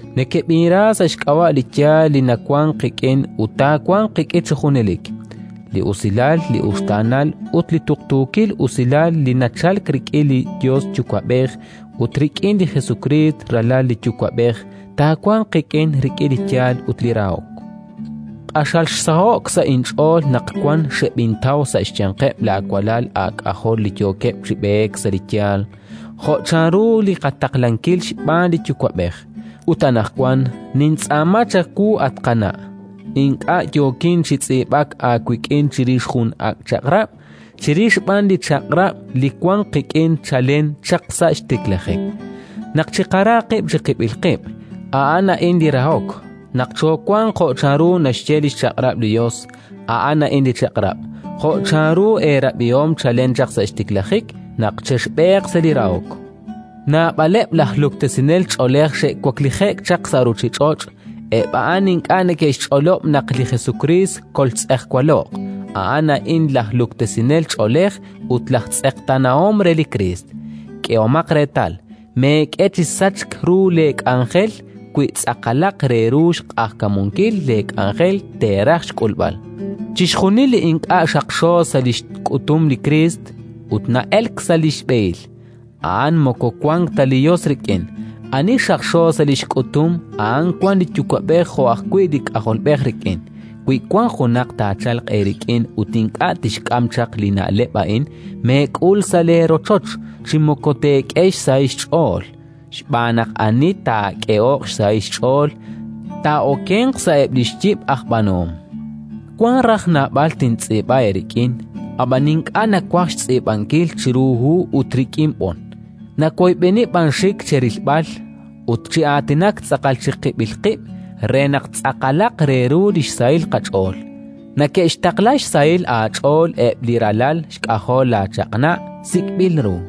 Nekeb'inra sa' xk'ab'a' li yaal li nawank qik'in ut taawanq qik'in chi junelik. Li usilal, li uxtaanal ut li tuqtuukil usilal li nachalk rik'in li Yos Yuwa'b'ej ut rik'in li Jesukriist, Ralal li Yuwa'b'ej, taawanq qik'in rik'in li yaal ut li rahok. Q'axal xsaho'k sa' inch'ool naq wan xeb'intaw sa' xyanqeb' laawalal aak'ajol li yookeb' chi b'eek sa' li yaal, jo' chanru li qataqlankil xb'aan li Yuwa'b'ej. Ut anaqwan nintz'aama chawu, at Qana' (ink'a' yookin chi tz'iib'ak aawik'in chirix jun li ak' chaq'rab', chirix b'an li chaq'rab' li wank qik'in chalen chaq sa' xtiklajik), naq chiqara qib' chiqib'il qib'. A'an a'in li rahok: naq choowanq jo' chanru naxye li xchaq'rab' li Yos. A'an a'in li chaq'rab' (jo' chanru eerab'ihom chalen chaq sa' xtiklajik), naq chexb'eeq sa' li rahok. Naab'aleb' laj luktesinel ch'oolej xe'waklije'k chaq sa' ruuchich'och': eb' a'an ink'a' neke'xch'olob' naq li Jesukriist koltz'ejwalo'q. A'an a'in laj Luktesinel ch'oolej ut laj Tz'eqtaanahom re li Kriist. K'ehomaq reetal, meek'e chi sachk ru leek'anjel, wi tz'aqalaq re ru xq'ajkamunkil leek'anjel teeraj xk'ulb'al. Chixjunil li ink'a' xaqxo sa' li xk'utum li Kriist ut na'elk sa' li xb'ehil, a'an moko wank ta li Yos rik'in. Ani xaqxo sa' li xk'utum, a'an wank li Yuwa'b'ej jo' ajwi' li K'ajolb'ej rik'in. Wi wank junaq taachalq eerik'in ut ink'a' tixk'am chaq li na'leb' a'in, meek'ul sa' leerochoch chi moko teek'e xsahil xch'ool, xb'aan naq ani taak'ehoq xsahil xch'ool, taa'okenq sa'eb' li xyib' aj b'aanuhom. Wank raj naab'al tintz'iib'a eerik'in, ab'an ink'a' nawaj xtz'iib'ankil chiru hu ut rik'in b'on, nawoyb'eni b'an xik cherilb'al ut chi aatinak tz'aqal chiqib'il qib' re naq tz'aqalaq re ru li xsahil qach'ool. Neke'xtaqla xsahil aach'ool eb' li ralal xk'ajol laaChaq'na' sik'b'il ru.